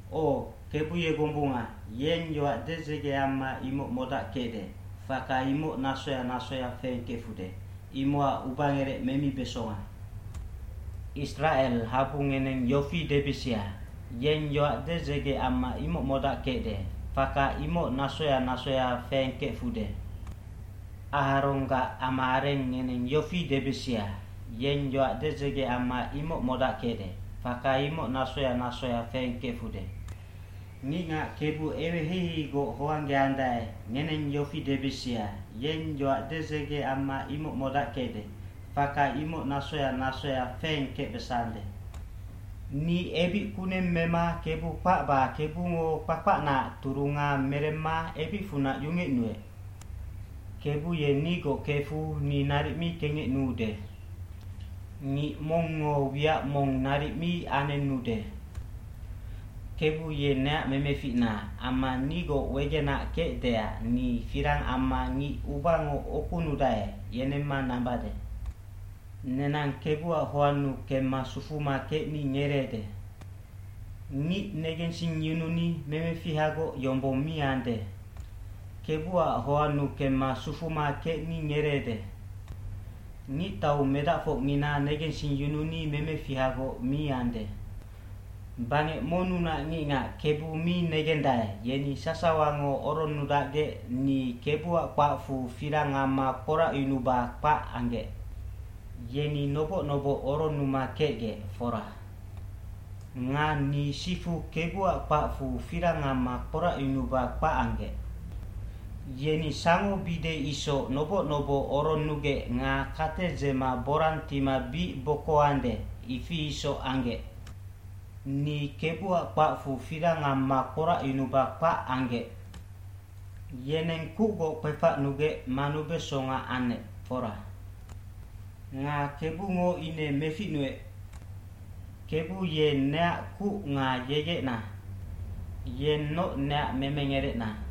aO, Kebu ye gombunga, yeng yoac dedzege amma imoc modackecde, faka imoc nasoya nasoya feengkefude, imocac ubangerec memibesonga. Isracel habu ngeneng yofi debisia, “Yeng yoac dedzege amma imoc modackecde, faka imoc nasoya nasoya feengkefude.” Aharonggac ama areng ngeneng yofi debisia, “Yeng yoac dedzege amma imoc modackecde, faka imoc nasoya nasoya feengkefude.” Ngicngac Kebu eweheiheigoc hoanggeandae, ngeneng yofi debisia, “Yeng yoac dedzege amma imoc modackecde, faka imoc nasoya nasoya feengkecbesande.” Ni ebic kuneng mema Kebu kpacba Kebungo kpakpacnaac turunga meremma ebicfunac yungecnuec.b cKebu ye nigoc kefu ni naric mi kengecnuude. Ngic mongngo wiac mong naric mi anenude. Kebu ye neac memeficna amma nigoc wegenac kecdeac ni firang amma ngic ubango ukunudae yenemma nambade. Nenang Kebuac hoannu kemma sufuma kecni ngereede. Ngic negensingyununi memefihagoc yombong mi ande. Kebuac hoannu kemma sufuma kecni ngereede. Ngictau medacfocngina negensingyununi memefihagoc mi ande. Bangec monnunac ngicngac Kebu mi negendae, yeni sasawango oronnudacgec ni Kebuac kpacfu firang amma kporacyunuba kpac anggec. Yeni noboc noboc oronnuma kecgec, fora. Nga ni sifu Kebuac kpacfu firang amma kporacyunuba kpac anggec. Yeni sangobide isoc noboc noboc oronnugec nga kate dzema borang tima bic bokoande, ifi isoc anggec. Ni Kebuac kpacfu firang amma kporacyunuba kpac anggec. Yeneng kucgoc kpefacnugec manubesonga anec, fora. Nga Kebungo ine meficnuec. dKebu ye neac kuc nga yegecna. Yennoc neac memengerecna.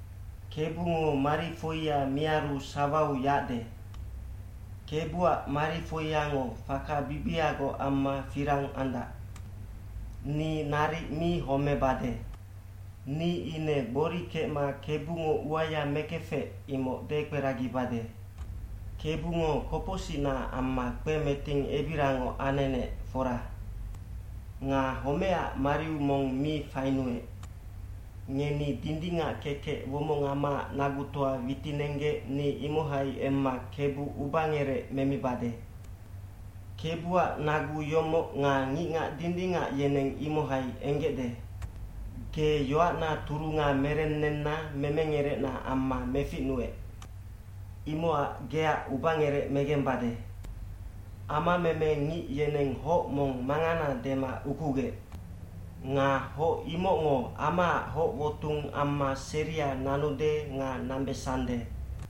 Kebungo marifoia miaru sawau yacde. Kebuac marifoiango faka bibiagoc amma firang andac.” Ni naric mi homebade. Ni ine gbori kecma Kebungo uaya mekefec, imoc dekperagibade. Kebungo kopocsicnaac amma kpemeting ebirangoc anenec, fora. Nga homecac mariu mong mi fainuec. Ngeni dindingac kekec womongamaac nagutoa witinenggec ni imohai emma Kebu ubangerec memibade. Kebuac nagu yomoc nga ngicngac dindingac yeneng imohai enggecde. Ge yoacna turunga merennenna memengerecna amma meficnunec. Imocac geac ubangerec megembade. e fAmameme ngic yeneng hoc mong mangana dema ukugec. Nga hoc imocngo amaac hoc wotung amma seria nanude nga nambesande.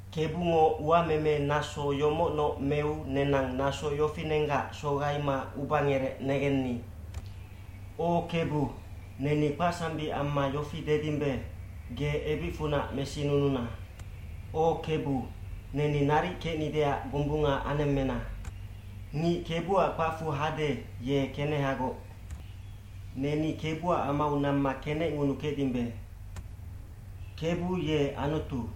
Kebungo uamemenaso yomocnoc meu nenang naso yofinenggac sogaima ubangerec negenni. gO Kebu, neni kpacsambic amma yofi dedimbe, “Ge ebicfunac mesinununa. O Kebu, neni naric kecnideac gombunga anemmena.” hNgic Kebuac kpacfu hade, ye kenehagoc. Neni Kebuac amau namma kenecngunukecdimbe. Kebu ye Anutu.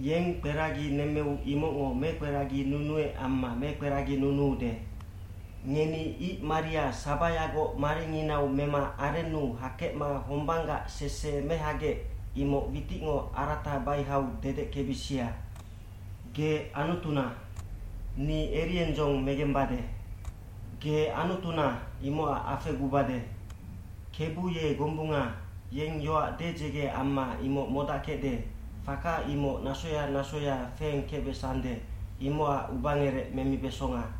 Yeng kperagi nemmeu imocngo mekperaginunuec amma mekperaginunuude. Ngeni ic maria sabayagoc maringinau mema arennu hakecma hombanggac sese mehagec, imoc witicngo arata baihau dedeckebisia. Ge Anutuna. Ni eriendzong megembade. Ge Anutuna, imocac afegubade. Kebu ye gombunga, yeng yoac dedzege amma imoc modackecde, faka imoc nasoya nasoya feengkecbesande, imocac ubangerec memibesonga.